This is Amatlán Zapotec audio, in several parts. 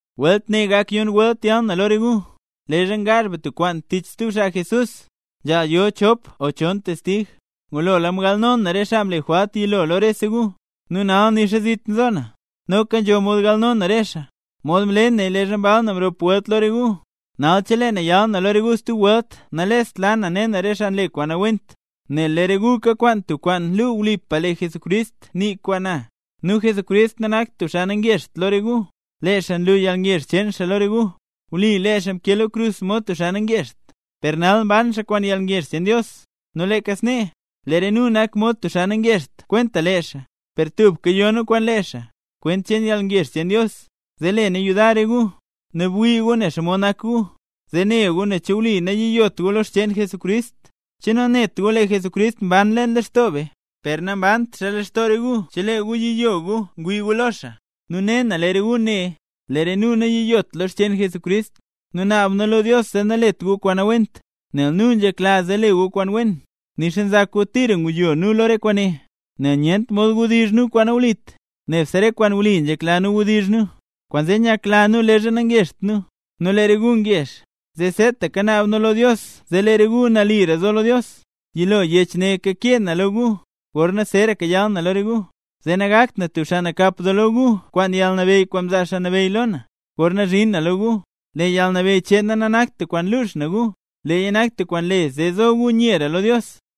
Welt ne gak yon welt yal na lo re gu. Leezha ngaazh be tub kwaan tich stub xaa Jesús, nzhaal yo chop o chon testig. Ngulola mgalno na re xaa mle jwalt yilo lo rese gu, nu nal nixa zit nzo na, noka nzho mod galno na re xaa, mod mle naya leezha mbal na mrop welt lo re gu. Nal chelee na yal na lo re gu stub welt nalest la na ne na re xaa nle kwaan nawent, nel lee re gu kakwaan tub kwaan luu wlipa lee Jesucrist nii kwaan na. Nu Jesucrist nanakt tub xaa nangezht lo re gu, lee xaa nlu yalngezh cheen xaa lo re gu. Wli lee xaa mkee lo krus mod tub xaa nangezht, per nal mban xaa kwaan yalngezh cheen Dios. Nu leeka snee, lee re nu nak mod tub xaa nangezht kwenta lee xaa, per tubka yo nu kwaan lee xaa, kwent cheen yalngezh cheen Dios, zee le nu yudar re gu. Nu bwii gu ne xomod nak gu, zee ne gu nen che wli nayiyot gu lo xcheen Jesucrist. ¿Che nanet gu lee Jesucrist mban leen lextoo be? ¡Per nambant xaa leen lextoo re gu chelee gu yiyo gu ngwii gu lo xaa! Nu ne na, lee re gu ne, lee re nu nayiyot lo xcheen Jesucrist. Nu naab nu lo Dios zee nalet gu kwaan nawent, nel nu nzhekla zee nzho mod le gu kwaan wen, nixa nzak gu tira nguyo nu lo re kwaane. Nel nyent mod wdizh nu kwaan nawlit, nebse re kwaan wli nzhekla nu nzhedizh nu. Kwaanzee nyakla nu leezha nangezht nu, nu lee re gu ngezh, zee seetaka naab nu lo Dios zee lee re gu nalira zo lo Dios. Yilo yech ne kakee na lo gu gorna zeeraka yal na lo re gu, zee nagakt na tub xaa nakap doo lo gu kwaan yalnabeyy kwaan mzaa Xaa Nabeyy lo na, gorna zhin na lo gu. Lee yalnabeyy cheen na nanakt tub kwaan lux na gu, leeya nak tub kwaan le zee zo nyera gu lo Dios.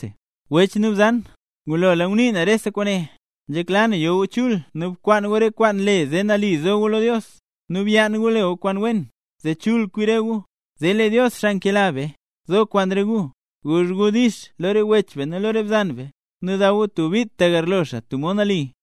Wech nu bzan, ngulola ngunii na rese kwaane. Nzhekla na yo gu chul nu bkwaan gu re kwaan le zee nali zo gu lo Dios, nu byaan gu le gu kwaan wen, zee chul kwi re gu, zee lee Dios xaa nkela be, zo kwaan re gu. Guzh gu “dix” lo re wech nu lo re bzan, nu daw gu tub bit tagarlo xaa tub mod nali.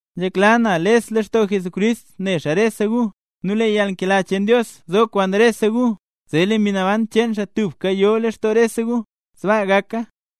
Nzhekla na les lextoo Jesucrist ne rese gu, nu lee yalnkela cheen Dios zo kwaan rese gu, zee lee Mbi Naban cheen xaa tubka yo leen lextoo rese gu. Sbaa gaka.